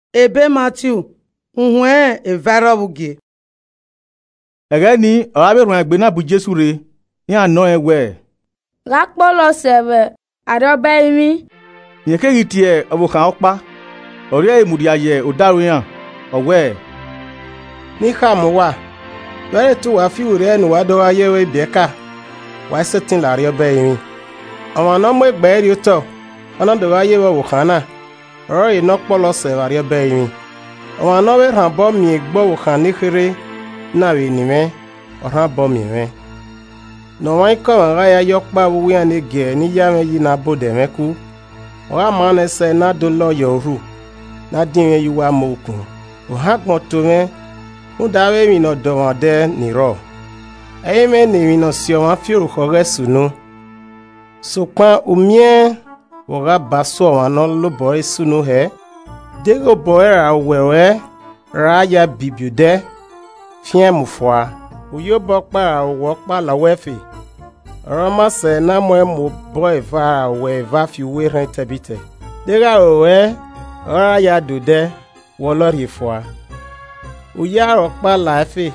Gha Ọkpọlọ Se? Ẹghẹ ni ọre avbe erhuanegbe na bu Jesu rre, iran nọ rẹn wẹẹ, “Gha ọ kpọlọ sẹ vbe Arriọba ẹrinmwi?” Rẹn keghi tie ọvbokhan ọkpa, ọ rhie ẹre mudia ye odaro iran. Ọ wẹẹ, “Ne I khama uwa, vbe ẹ i re te uwa fiwerriẹ ne uwa do gha ye vbe ibiẹka, wa i sẹtin la Arriọba ẹrinmwi. Ọmwa ne ọ mu egbe ẹre rriotọ ọ na do gha ye vbe ọvbokhan na, ọrọre ne ọ kpọlọ sẹ vbe Arriọba ẹrinmwi. Ọmwa ne ọ vbe rhan obọ miẹn egbe ọvbokhan nekherhe na vbe eni mwẹ, ọ rhan obọ miẹn mwẹ. “Ne ọmwaikọmwa gha ya ye ọkpa vbe uwu iran ne giẹrẹ ni ya mwẹ yi na ba odẹ mwẹ ku, ọ gha ma nẹẹn sẹ ne a de olọ ye ọre urhu, ne a dinmwi ẹn ye uwu amẹ okun. Ohan agbọn to mwẹ rhunmwuda avbe emwi ne ọ de ọmwa odẹ ni rrọọ. Ẹ i mwẹ ne emwi ni si ọmwa fi orukhọ ghẹ sunu. Sokpan u miẹn vbe ọ gha ba so ọmwa ne ọ la obọ ẹre sunu hẹẹ. “Deghẹ obọ ruẹ ra owẹ ruẹ ra ya a bibi odẹ, fian ẹn mu fua, u ya obọ ọkpa ra owẹ ọkpa la uwu ẹfe, ọre ọ maa sẹ ne a mu ẹn mu obọ eva ra owẹ eva fi uwu erhẹn etẹbitẹ. Deghẹ aro ruẹ ọre ọ ra ya de odẹ, wọlọe rhie fua. U ya aro ọkpa la ẹfe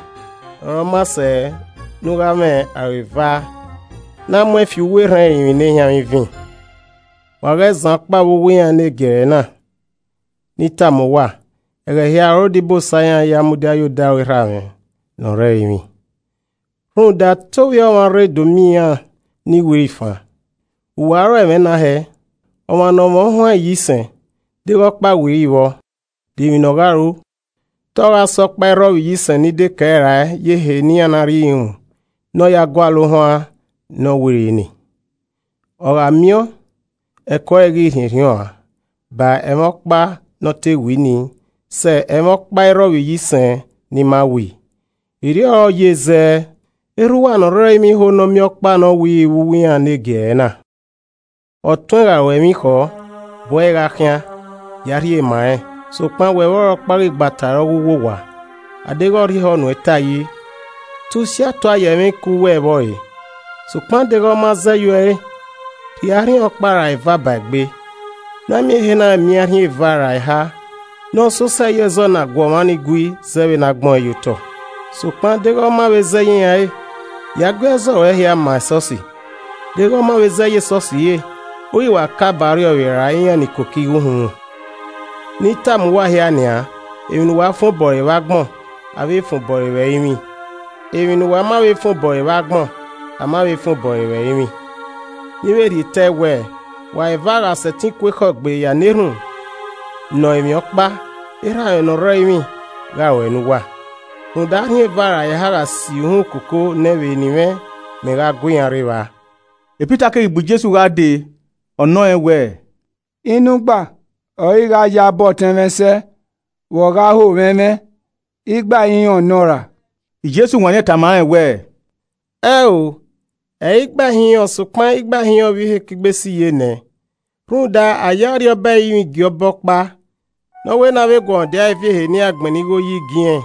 ọre ọ maa sẹ ne u gha mwẹ aro eva ne a mu ẹn fi uwu erhẹn ẹrinmwi ne ehianmwẹ ivin. “Wa ghẹ zan ọkpa vbe uwu iran ne giẹrẹ na. Ne I tama uwa, ẹghẹ hia ọre odibosa iran ya mudia ye odaro Erha mwẹ ne ọ rre ẹrinmwi. [ Rhunmwuda te Ovbi Ọmwa rre do miẹn iran ni wiri fan.] Vbe uwa ro ẹmwẹ na hẹẹ? Ọmwa ne ọ mwẹ ohuan iyisẹn, deghẹ ọkpa wiri vbọ, de emwi ne ọ gha ru? Te ọ gha sẹ ọkpa i rrọ vbe iyisẹn ni dekẹe rae ye ehe ne iran na rri irunmwu ne ọ ya gualọ ohuan ne ọ wiri nii. Ọ gha miẹn ọẹn, ẹko ẹre ghi rhiẹnrhiẹn uan ba ẹmwẹ ọkpa ne ọ te wi nii sẹ ẹmwẹ ọkpa i rrọ vbe iyisẹn ni ma wii. Erriọ ọre ọ ye zẹẹ erha uwa ne ọ rre ẹrinmwi i ho ne a miẹn ọkpa ne ọ wiri vbe uwu iran ne giẹrẹ na. “Ọtuẹn gha ru uẹ emwi khọ, bu ẹre gha khian, ya rhie ma rẹn. Sokpan wẹ vbe ọre ọkpa ghi gba ta ẹre ọ ghe uwu owa. a deghẹ ọ rhie ehọ nuẹn ta yi, te usi atua ye ẹmwẹ iku uwẹ vbe ọre. Sokpan deghẹ ọ ma zẹ ye uẹ re. rhie arhin ọkpa ra eva ba egbe, ne a miẹn ehe na miẹn arhin eva ra eha ne ọ sẹ osẹe ye ẹzọ ne a gu ọmwa ni gui zẹẹ vbe ne a gbẹn ọẹn ye otọ. Sokpan deghẹ ọ ma vbe zẹ ye iran ẹre, ya gui ẹzọ ruẹ hia ma esọsi. Deghẹ ọ ma vbe zẹ ye esọsi re, u ghi wa kae ba ọrriọvbe ra iran ni koko igho uhunmwu. “Ne I tama uwa hia nian, emwi ne uwa fan obọ ẹre vbe agbọn, a vbe fan obọ ẹre vbe ẹrinmwi. Emwi ne uwa ma vbe fan obọ ẹre vbe agbọn, a ma vbe fan obọ ẹre vbe ẹrinmwi. “Ne I vbe rhie tẹe wẹẹ, wa eva gha sẹtin ku ekhọe gbe ya na erhunmwu nọ emwi ọkpa, Erha mwẹ ne ọ rre ẹrinmwi gha ruẹe ne uwa. Rhunmwuda arhin eva ra eha gha si uhunmwu koko nẹ vbe eni mwẹ, mẹ wa gu iran rre evba.” Pita keghi bu Jesu gha dee, ọ nọ rẹn wẹẹ, “Inu igba ọre I gha yabọ ọtẹn mwẹ sẹ vbe ọ gha ho mwẹ ẹmwẹ? Igba ihinrọn nọ ra?” Jesu wanniẹn tama rẹn wẹẹ, “Ẹn o, ẹ i re igba ihinrọn sokpan igba ihinrọn vbe ihe ekigbe sẹ iyenẹ. Rhunmwuda, a ye Arriọba ẹrinmwi gie ọba ọkpa ne ọ wẹ ne avbe eguọmwadia ẹre viọ ebe ne iran gbẹnnẹ igho yi gie irẹn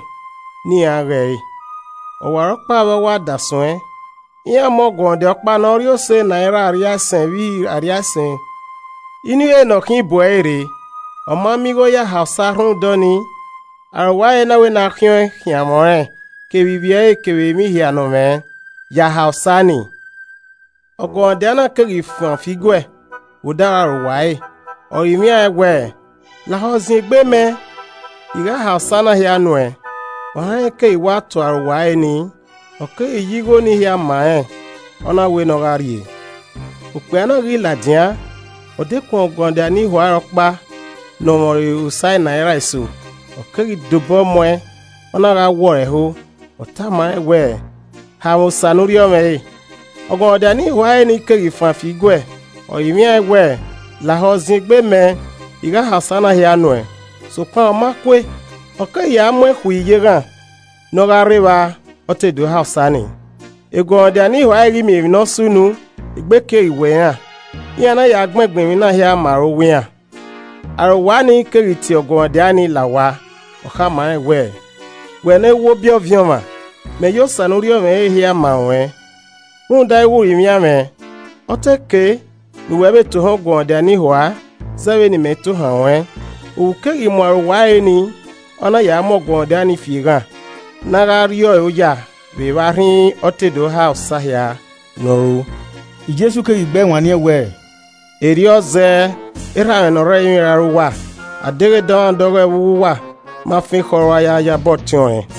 ne iran ghe ẹre. Ọwarọkpa vbe ọ wa da suẹn, iran mu ọguọmwadia ọkpa ne ọ rri ẹre osa enaira arriaisẹn vbe ihe arriaisẹn inu ihe ne ọ khin, bu ẹre rre. Ọ ma miẹn igho ya ha osa rhunmwuda ọnii, arowa ẹre na wẹ ne a khiẹn ọẹn khiẹn amwẹ ọnrẹn kevbe ivbi ẹre kevbe emwi hia ne ọ mwẹ ya ha osa ni. Ọguọmwadia na keghi fan fi guẹ vbe odaro arowa ẹre, ọ rinmwian ẹn wẹẹ, ‘Lahọ ziengbe mẹ, I gha ha osa na hia nuẹn.’ Ohan rẹn keghi wa to arowa ẹre ni, ọ keghi ya igho ni hia ma rẹn, ọ na wẹ ne ọ gha rrie. “Okpia na ghi ladian, ọ dekun ọguọmwadia ne ihua ẹre ọkpa ne ọ mwẹ ọre osa enaira eso. Ọ keghi de obọ muẹn, ọ na gha wọ ẹre ẹho, ọ tama rẹn wẹẹ, ‘Ha mwẹ osa ne u rriọ mwẹ rẹ.’ Ọguọmwadia ne ihua ẹre ni keghi fan fi iguẹ, ọ rinmwian ẹn wẹẹ, ‘Lahọ ziengbe mẹ, I gha ha osa na hia nuẹn.’ Sokpan, ọ ma kue. Ọ keghi ya muẹn khui ye eghan ne ọ gha rre evba ọ te do ha osa ni. Eguọmwadia ne ihua ẹre ghi miẹn emwi ne ọ sunu, egbe keghi wọọ iran, iran na ya gbẹngbẹn emwi na hia ma arowa iran. Arowa nii keghi tie ọguọmwadia nii, la owa, ọ khama rẹn wẹẹ, ‘Wẹ ne ẹwobi ọviẹn ọmwa, mẹ ya osa ne u rriọ mwẹ re hia ma ruẹn rhunmwuda ighe u rinmwian mwẹ. Ọ te kei ne uwẹ vbe tohan ọguọmwadia ne ihua zẹ vbene imẹ tohan ruẹn.’ Ohu keghi mu arowa ẹre nii, ọ na ya mu ọguọmwadia ni fi eghan, ne a gha rri ọre oya vbe evba rhinrin ọ te do ha osa hia ne ọ ru.” Jesu keghi gbe ẹe wanniẹn wẹẹ, “Erriọ zẹẹ. Erha mwẹ ne ọ rre ẹrinmwi ra ru uwa, adeghẹ dọmwadẹ ọghọe vbe uwu uwa ma fan ekhọe rua yabọ ọtẹn ọnrẹn.”